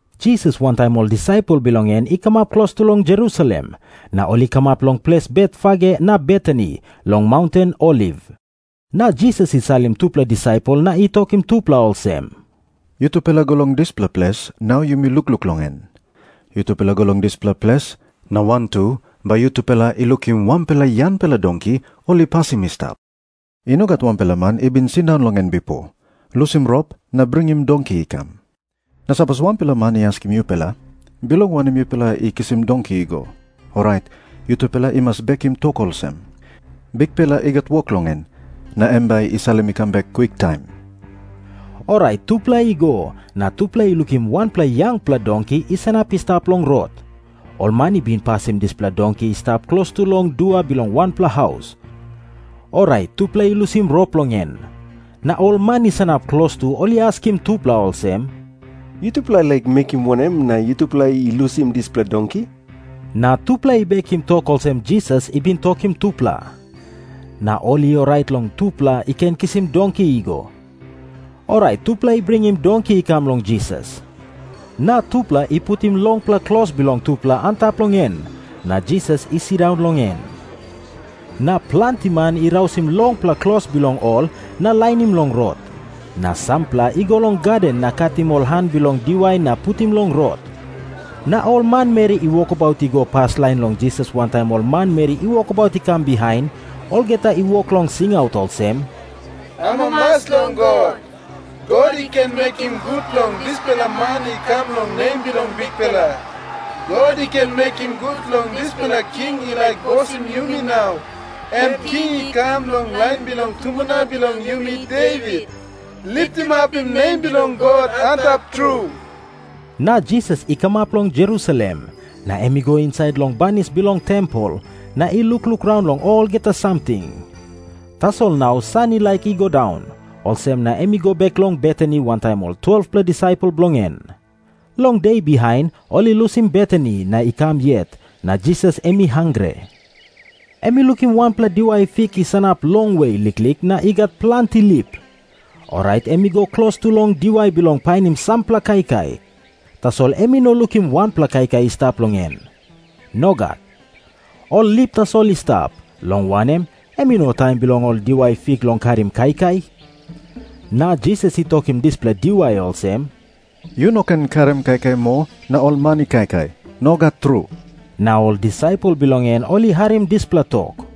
Jisas wantaim ol disaipel bilong en i kamap klostu long Jerusalem, na ol i kamap long ples Betfage na Betani, long maunten Oliv. Na Jisas i salim tupela disaipel na i tokim tupela olsem, “Yutupela go long dispela ples nau yumi lukluk long en. Yutupela go long dispela ples, na wantu bai yutupela i lukim wanpela yangpela donki ol i pasim i stap. I no gat wanpela man i bin sindaun long en bipo. Lusim rop na bringim donki i kam. Na sapos wanpela man i askim yutupela, ‘Bilong wanem yutupela i kisim donki i go?’, orait yutupela i mas bekim tok olsem, ‘Bikpela i gat wok long en, na em bai i salim i kam bek kwiktaim.’” Orait tupela i go, na tupela i lukim wanpela yangpela donki i sanap i stap long rot. Ol man i bin pasim dispela donki i stap klostu long dua bilong wanpela haus. Orait tupela i lusim rop long en. Na ol man i sanap klostu ol i askim tupela olsem, “Yutupela i laik mekim wanem na yutupela i lusim dispela donki?” Na tupela i bekim tok olsem Jisas i bin tokim tupela. Na ol i orait long tupela i ken kisim donki i go. Orait tupela i bringim donki i kam long Jisas. Na tupela i putim longpela klos bilong tupela antap long en, na Jisas i sindaun long en. Na planti man i rausim longpela klos bilong ol na lainim long rot. Na sampela i go long gaden na katim ol han bilong diwai na putim long rot. Na ol manmeri i wokabaut i go paslain long Jisas wantaim ol manmeri i wokabaut i kam bihain, olgeta i wok long singaut olsem, “Amamas long God. God i ken mekim gut long dispela man i kam long nem bilong Bikpela. God i ken mekim gut long dispela king i laik bosim yumi nau, em king i kam long lain bilong tumbuna bilong yumi, Devit. Litimapim nem bilong God Antap Tru!” Na Jisas i kamap long Jerusalem, na em i go insait long banis bilong tempel, na i lukluk raun long olgeta samting. Tasol nau san i laik i go daun, olsem na em i go bek long Betani wantaim ol 12-pela disaipel bilong en. Long de bihain ol i lusim Betani na i kam yet, na Jisas em i hangre. Em i lukim wanpela diwai fik i sanap longwe liklik na i gat planti lip. Orait em i go klostu long diwai bilong painim sampela kaikai, tasol em i no lukim wanpela kaikai i stap long en. Nogat. Ol lip tasol i stap, long wanem, em i no taim bilong ol diwai fik i karim kaikai. Na Jisas i tokim dispela diwai olsem, “Yu no ken karim kaikai moa na ol man i kaikai. Nogat tru.” Na ol disaipel bilong en ol i harim dispela tok.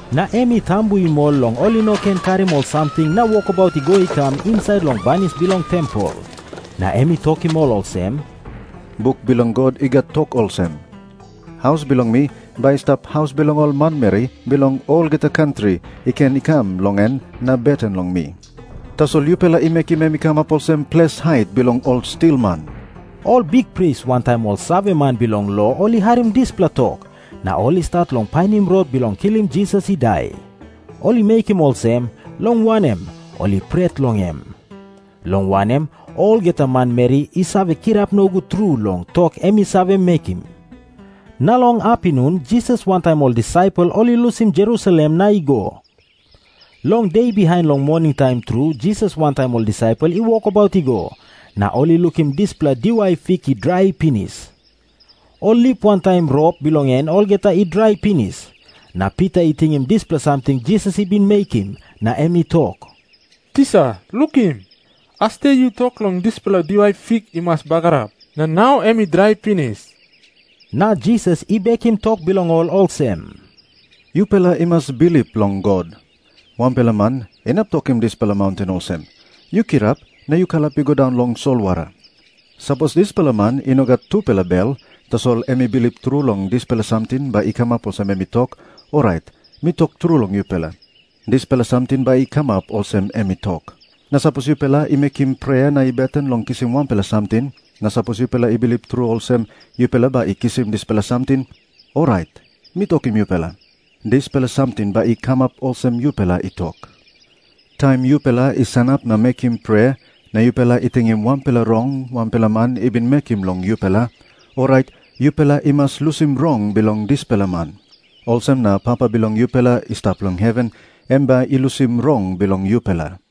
Na em i tambuim ol long ol i no ken karim ol samting na wokabaut i go i kam insait long banis bilong tempel. Na em i tokim ol olsem, “Buk bilong God i gat tok olsem, ‘Haus bilong mi bai i stap haus bilong ol manmeri bilong olgeta kantri i ken i kam long en na beten long mi.’ Tasol yupela i mekim em i kamap olsem ples hait bilong ol stilman.” Ol bikpris wantaim ol saveman bilong lo ol i harim dispela tok, na ol i stat long painim rot bilong kilim Jisas i dai. Ol i mekim olsem, long wanem, ol i pret long em. Long wanem, olgeta manmeri i save kirap nogut tru long tok em i save mekim. Na long apinun Jisas wantaim ol disaipel ol i lusim Jerusalem na i go. Long de bihain long moningtaim tru Jisas wantaim ol disaipel i wokabaut i go, na ol i lukim dispela diwai fik i drai pinis. Ol lip wantaim rop bilong en olgeta i drai pinis. Na Pita i tingim dispela samting Jisas i bin mekim, na em i tok, “Tisa, lukim. Asde yu tok long dispela diwai fik i mas bagarap. Na nau em i drai pinis.” Na Jisas i bekim tok bilong ol olsem, “Yupela i mas bilip long God. Wanpela man inap tokim dispela maunten olsem, ‘Yu kirap na yu kalap i go daun long solwara.’ Sapos dispela man i no gat tupela bel, tasol em i bilip tru long dispela samting bai i kamap olsem em i tok, orait mi tok tru long yupela, dispela samting bai i kamap olsem em i tok. Na sapos yupela i mekim prea na i beten long kisim wanpela samting, na sapos yupela i bilip tru olsem, yupela bai i kisim dispela samting, orait mi tokim yupela, dispela samting bai i kamap olsem yupela i tok. “Taim yupela i sanap na mekim prea, na yupela i tingim wanpela rong wanpela man i bin mekim long yupela, orait yupela i mas lusim rong bilong dispela man. Olsem na Papa bilong yupela i stap long heven em bai i lusim rong bilong yupela.”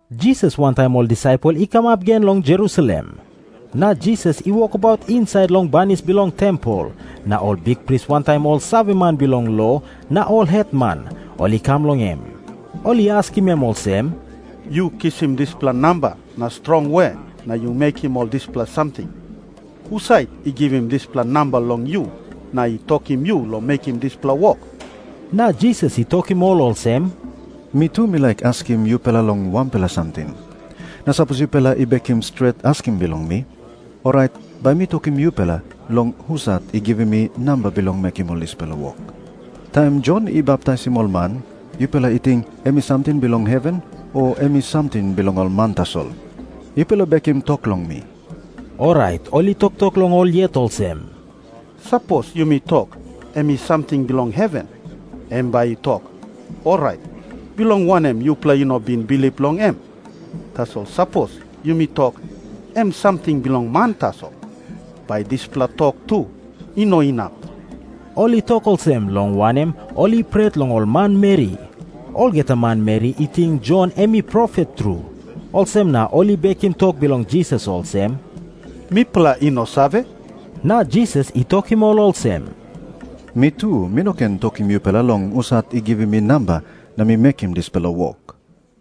Jisas wantaim ol disaipel i kamap gen long Jerusalem. Na Jisas i wokabaut insait long banis bilong tempel, na ol bikpris wantaim ol saveman bilong lo na ol hetman ol i kam long em. Ol i askim em olsem, “Yu kisim dispela namba na strong we na yu mekim ol dispela samting? Husat i givim dispela namba long yu na i tokim yu long mekim dispela wok?” Na Jisas i tokim ol olsem, “Mi tu mi laik askim yupela long wanpela samting. Na sapos yupela i bekim stret askim bilong mi, orait bai mi tokim yupela long husat i givim mi namba bilong mekim ol dispela wok. Taim Jon i baptaisim ol man, yupela i ting em i samting bilong heven, o em i samting bilong ol man tasol? Yupela bekim tok long mi.” Orait ol i toktok long ol yet olsem, “Sapos yumi tok, ‘Em i samting bilong heven,’ em bai i tok, ‘Orait bilong wanem yupela i no bin bilip long em?’ Tasol sapos yumi tok, ‘Em i samting bilong man tasol,’ bai dispela tok tu i no inap.” Ol i tok olsem, long wanem, ol i pret long ol manmeri. Olgeta manmeri i ting Jon em i profet tru. Olsem na ol i bekim tok bilong Jisas olsem, “Mipela i no save.” Na Jisas i tokim ol olsem, “Mi tu mi no ken tokim yupela long husat i givim mi namba na mi mekim dispela wok.”